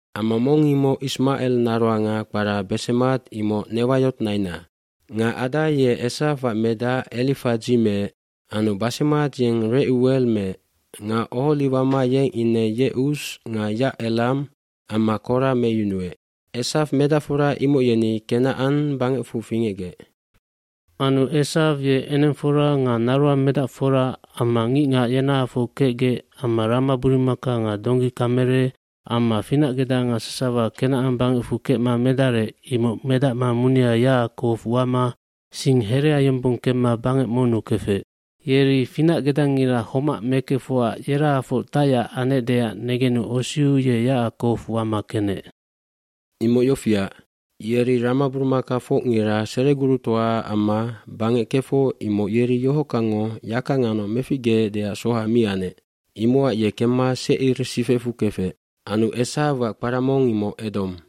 cAmma mong imoc Ismacel naroanga kpara Besemat imoc Newayot naina. Nga Ada ye Esawac medac Elifadzi meec anu Basemat yeng Recucel meec nga Oholiwama yeng ine Yecus nga Yacelam amma Kora meyunuec. Esaw medacfora imoc yeni Kenacan bangecfu fingecgec. Anu Esaw ye enengfora nga naroangmedacfora amma ngicngac yenahafoc kecgec amma ramaburumaka nga donggikamele amma finacgedanga sasawa Kenacan bangecfu kecma medarec imoc medacma munia Yacakow wama sing herea yombong kemma bangec monnu kefec. dYeri finacgedangira homac mekefocac yerahafoc tacyac anecdeac negenu osiu ye Yacakow wama kenec. Imoc yofiac, yeri ramaburumakafocngira seregurutoaac amma bangec kefoc imoc yeri yohockangngo yaka nganoc meficgeecdeac soha mi anec. eImocac ye kemma Secir sifecfu kefec. Anu Esawac kpara mong imoc Edom.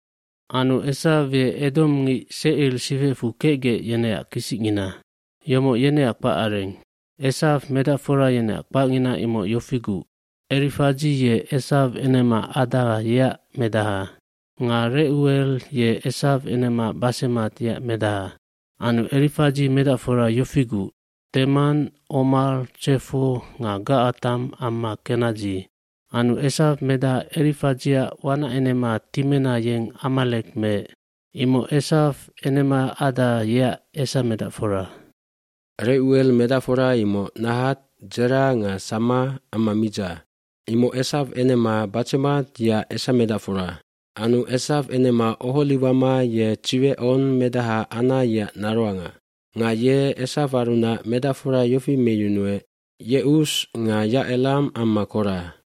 fAnu Esaw ye edomngic Secir sifecfu kecgec yeneac kisicngina. Yomoc yeneac kpacareng. Esaw medacfora yeneac kpacngina imoc yofiguc, Elifadzi ye Esaw enema Ada yeac medaha. Nga Recucel ye Esaw enema Basemat yeac medaha. Anu Elifadzi medacfora yofiguc, Teman, Omar, Tsefo nga Gacatam amma Kenadzi. Anu Esaw medaha Elifadziac wanacenema Timena yeng Amalek meec. Imoc Esaw enema Ada yeac esamedacfora. Recucel medacfora imoc Nahat, Dzera nga Samma amma Midza. Imoc Esaw enema Basemat yeac esamedacfora. gAnu Esaw enema Oholiwama ye Tsiwecon medaha Ana yeac naroanga. Nga ye Esawarunac medacfora yofi meyunuec Yecus nga Yacelam amma Kora.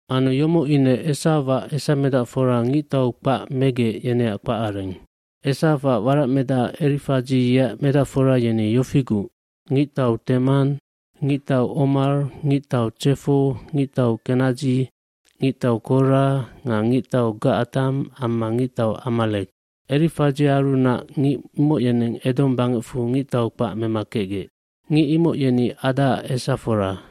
Anu yomoc ine Esawac esamedacfora ngictau kpac megec yeneac kpacareng. Esawac waracmedaha Elifadzi yeac medacfora yeni yofiguc, ngictau Teman, ngictau Omar, ngictau Tsefo, ngictau Kora nga ngictau Gacatam amma ngictau Amalek. Elifadziarunac ngic imoc yeneng Edom bangecfu ngictau kpac mema kecgec. Ngic imoc yeni Adaac esafora.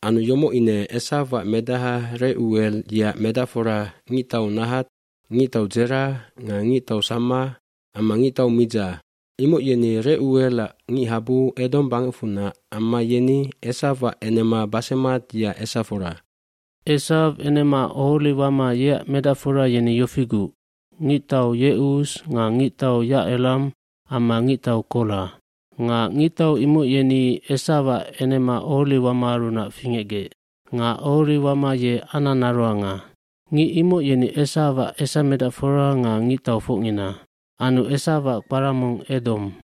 Anu yomoc ine Esawac medaha Recucel yeac medacfora ngictau Nahat, ngictau Dzera nga ngictau Samma amma ngictau Midza. Imoc yeni Reuelac ngichabu Edom bangecfunac amma yeni Esawac enema Basemat yeac esafora. Esaw enema Oholiwama yeac medacfora yeni yofiguc, ngictau Yecus nga ngictau Yacelam amma ngictau Kora. Nga ngictau imoc yeni Esawac enema Oholiwamaarunac fingecgec. Nga Oholiwama ye Ana naroanga. Ngic imoc yeni Esawac esamedacfora nga ngictaufocngina. Anu Esawac kpara mong Edom.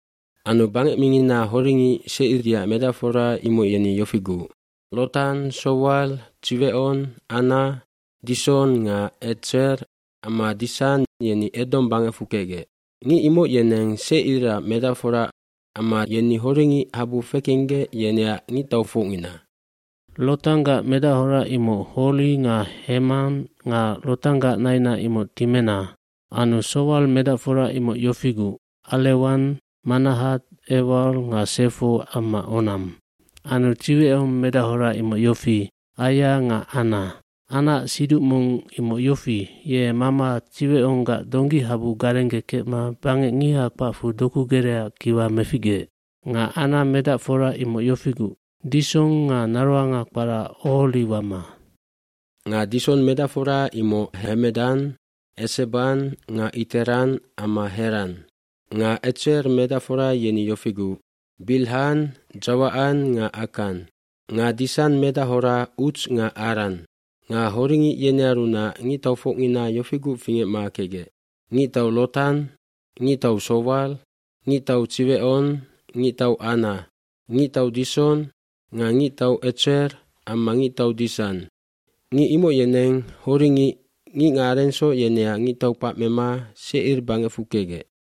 hAnu bangec mingina horingic Secir yeac medacfora imoc yeni yofiguc, Lotan, Sowal, Tsiwecon, Ana, Dison nga Etser amma Disan yeni Edom bangecfu kecgec. Ngic imoc yeneng Secirac medacfora amma yeni horingic habu fekenggec yeneac ngictaufocngina. Lotanggac medachora imoc Hori nga Hemam nga Lotanggac naina imoc Timena. Anu Sowal medacfora imoc yofiguc, Alewan, Manahat, Ewal nga Sefo amma Onam. Anu Tsiwecon medachora imoc yofi, Aia nga Ana. Anaac siduc mong imoc yofi, ye mama Tsiweconggac donggihabu garenggekecma bangec ngiha kpacfu doku gereaac kiwa meficgeec. Nga Ana nambaracfora imoc yofiguc, Dison nga naroanga kpara Oholiwama. Nga Dison medacfora imoc Hemedan, Eseban nga Iteran amma Heran. Nga Etser medacfora yeni yofiguc, Bilhan, Dzacawan nga Akan. Nga Disan medachora Uts nga Aran. Nga horingic yenearunac ngictaufocngina yofiguc fingecma kecgec, ngictau Lotan, ngictau Sowal, ngictau Tsiwecon, ngictau Ana, ngictau Dison nga ngictau Etser amma ngictau Disan. Ngic imoc yeneng horingic ngicngacarengsoc yeneac ngictau kpac mema Secir bangecfu kecgec.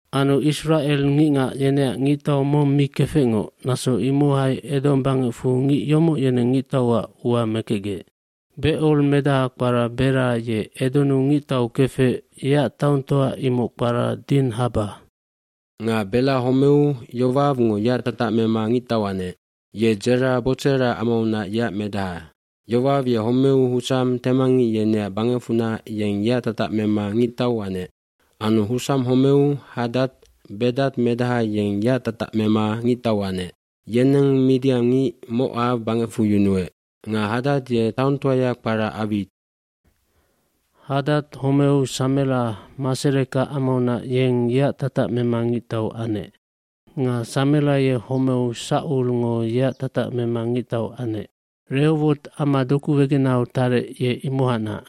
iAnu Isracel ngicngac yeneac ngictau mong mi kefecngoc naso imohai Edom bangecfu ngic yomoc yeneng ngictauac ua mekecgec. Becor medaha kpara Bela ye Edonnu ngictau kefec yeac taongtoa imoc kpara Dinhaba. Nga Bela homeu Yowawngo yeac tatac mema ngictau anec. Ye Dzera, Botsera amaunac yeac medaha. Yowaw ye homeu Husam, temangngic yeneac bangecfunac yeng yeac tatac mema ngictau anec. Anu Husam homeu Hadad, Bedad medaha yeng yeac tatac mema ngictau anec. Yeneng midiangngic Mocaw bangecfu yunuec. Nga Hadad ye taongtoaya kpara Awit. Hadad homeu Samela Masereka amaunac yeng yeac tatac mema ngictau anec. Nga Samela ye homeu Saculngo yeac tatac mema ngictau anec. Rehowot ama doku wegenahau tarec ye imohacnac.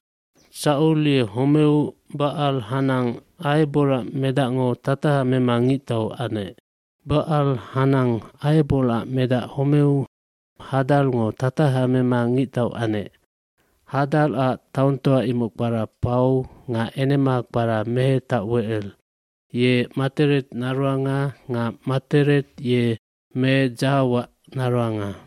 Sacul ye homeu Bacal Hanan, Aheborac medacngo tataha mema ngictau anec. Bacal-Hanan, Aheborac medac homeu Hadarngo tataha mema ngictau anec. Hadarac taongtoa imoc kpara Pau nga enema kpara Mehetawecel. Ye Matered naroanga nga Matered ye Me Dzahawac naroanga.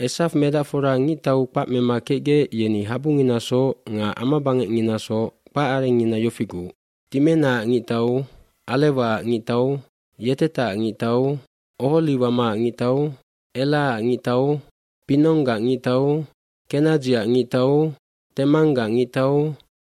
Esaw medacfora ngictau kpac mema kecgec yeni habunginasoc nga amabangecnginasoc kpacarengngina yofiguc, Timenaac ngictau, Alewaac ngictau, Yetetac ngictau, Oholiwamaac ngictau, Elaac ngictau, Pinonggac ngictau, Kenadziac ngictau, Temanggac ngictau,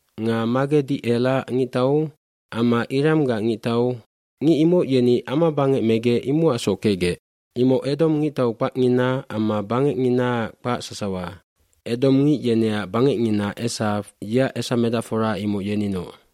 nga Magedicelac ngictau amma Iramgac ngictau. Ngic imoc yeni amabangec megec imocacsoc kecgec. Imoc Edom ngictau kpacngina amma bangecnginaac kpac sasawa. Edomngic yeneac bangecngina Esaw yeac esamedacfora imoc yeninoc.